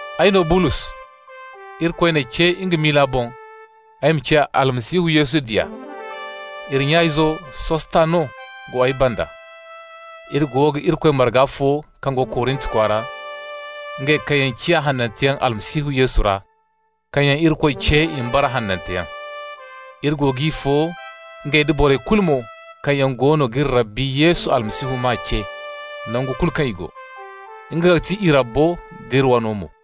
Ay no Bulos. Irikoy n'ay ce nga miila boŋ ay ma ciya Almasihu Yesu diya. Iri nya-izo Sostano go ay banda. Iri go ga Irikoy marga fo kaŋ go Korint kwaara, ngey kaŋ yaŋ ciya hananteyaŋ Almasihu Yesu ra, kaŋ yaŋ Irikoy ce i ma bara hananteyaŋ. Iri go g'i fo, ngey nda borey kulu mo kaŋ yaŋ goono g'iri Rabbi Yesu Almasihu maa ce, nangu kulu kaŋ i go. Nga ga ti i Rabbo d'iri wano mo.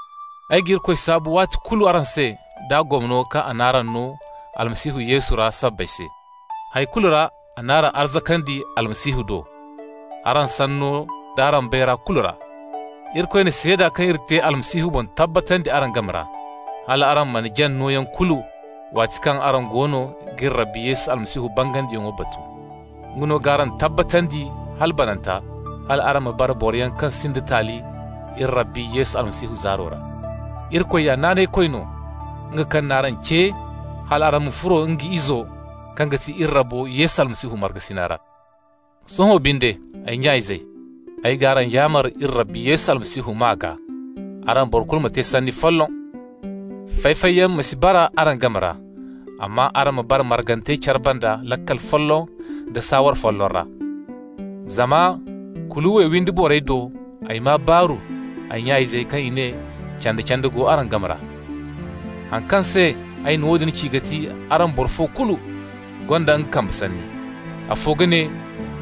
Ay ga Irikoy saabu waati kulu araŋ se d'a gomno kaŋ a n'araŋ no Almasihu Yesu ra sabbay se. Hay kulu ra a n'araŋ arzakandi Almasihu do, araŋ sanno d'araŋ bayra kulu ra. Irikoy na seeda kaŋ iri te Almasihu boŋ tabbatandi araŋ game ra hal araŋ mana jaŋ nooyaŋ kulu waati kaŋ araŋ goono g'iri Rabbi Yesu Almasihu bangandiyaŋo batu. Nga no g'araŋ tabbatandi hala bananta, hal araŋ ma bara boroyaŋ kaŋ sinda taali iri Rabbi Yesu Almasihu zaaro ra. Irikoy ya Naanaykoy no, nga kaŋ n'araŋ ce hal araŋ ma furo nga Izo, kaŋ ga ti iri Rabbo Yesu Almasihu, markasina ra. Sohõ binde, ay nya-izey, ay g'araŋ yaamar iri Rabbi Yesu Almasihu maa gaa: araŋ boro kulu ma te sanni folloŋ. Fay-fayyaŋ ma si bara araŋ game ra, amma araŋ ma bara margante care banda laakal folloŋ da saaware folloŋ ra. Zama Kuluwe windi borey do ay maa araŋ baaru, ay nya-izey, kaŋ i ne: canda-canda go no araŋ game ra. Haŋ kaŋ se ay na woodin ci ga ti araŋ boro fo kulu gonda nga kambe sanni. Afo ga ne: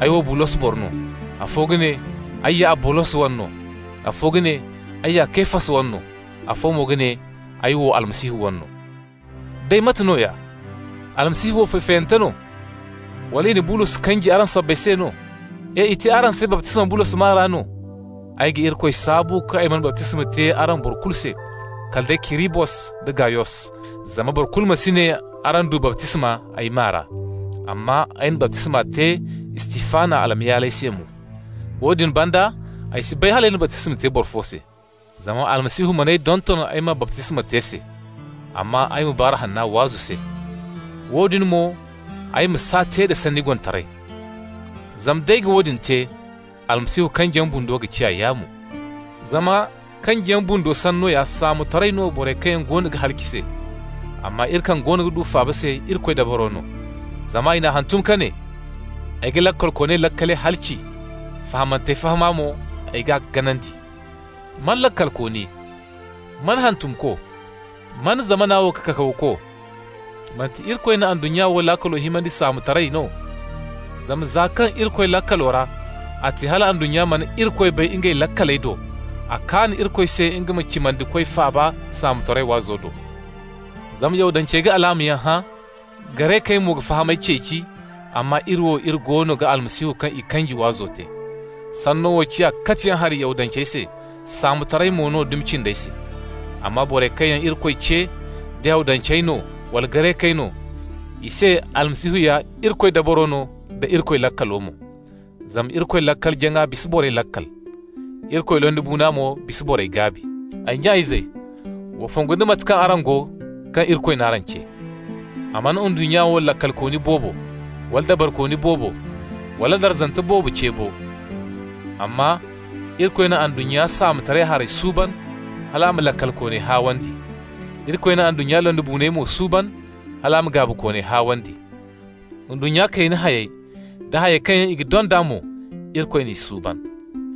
«Ay wo Bulos boro no.» Afo ga ne: «Ay ya Abolos wane no.» Afo ga ne: «Ay ya Kefas wane no.» Afo mo ga ne: «Ay wo Almasihu wane no.» Day mate nooya? Almasihu wo fay-fayante no? Wala i na Bulos kanji araŋ sabbay se no? E! I te araŋ se baptisma Bulos maa ra no? Ay ga Irikoy saabu kaŋ ay mana baptisma te araŋ boro kulu se, kala day Kirisbos da Gayos, zama boro kulu ma si ne araŋ du baptisma ay maa ra! (Amma ay na baptisma te Istifana almayaaley se mo. Woodin banda ay si bay hal ay na baptisma te boro fo se.) Zama Almasihu man'ay donton ay ma baptisma te se, amma ay ma Baaru Hanna waazu se. Woodin mo, ay ma s'a te da sanni gonitaray. Zama d'ay ga woodin te, Almasihu kanjiyaŋ bundo ga ciya yaamo. Zama kanjiyaŋ bundo sanno ya saamotaray no borey kaŋ yaŋ goono ga halaci se, amma iri kaŋ goono ga du faaba se Irikoy dabaro no. Zama i n'a hantum ka ne: «Ay ga laakalkooney laakaley halaci, fahamantey fahama mo, ay g'a ganandi.» Man laakalkooni? Man hantumko? Man zamana wo kakawko? Manti Irikoy na ndunnya wo laakalo himandi saamotaray no? Zama za kaŋ Irikoy laakalo ra, a te hala ndunnya mana Irikoy bay ngey laakaley do, a kaan Irikoy se nga ma cimandikoy faaba «saamotaray» waazo do. Zama Yahudancey ga alaamayaŋ hã. Garekey mo ga fahamay ceeci, amma iri wo, iri goono ga Almasihu kaŋ i kanji waazo te. Sanno wo ciya katiyaŋ hari Yahudancey se, saamotaray mo no dumi cindey se. Amma borey kaŋ yaŋ Irikoy ce, da Yahudancey no wala Garekey no, i se Almasihu ya Irikoy dabaro no da Irikoy laakalo mo. Zama Irikoy laakal-jaŋa bisa borey laakal. Irikoy londibuuna mo bisa borey gaabi. Ay nya-izey, wa fongu da mate kaŋ araŋ go kaŋ Irikoy n'araŋ ce. A mana ndunnya wo laakalkooni boobo, wala dabarikooni boobo, wala darzante boobo ce bo. Amma Irikoy na ndunnya saamotaray harey suuban hal a ma laakalkooney haawandi. Irikoy na ndunnya londibuuney mo suuban hal a ma gaabikooney haawandi. Ndunnya kayna hayey, da hayey kaŋ yaŋ i ga donda mo, Irikoy n'i suuban.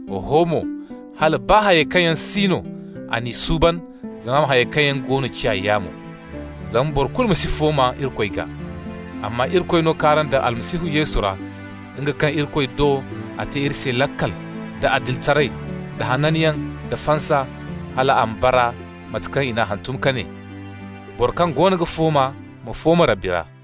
Oho mo, hala baa hayey kaŋ yaŋ si no, a n'i suuban zama a ma hayey kaŋ yaŋ go no ciya yaamo. Zama boro kulu ma si fooma Irikoy gaa. Amma Irikoy no k'araŋ daŋ Almasihu Yesu ra, nga kaŋ Irikoy do a te iri se laakal, da adilitaray, da hananyaŋ, da fansa, hal a ma bara mate kaŋ i n'a hantum ka ne: «Boro kaŋ goono ga fooma ma fooma Rabbi ra.»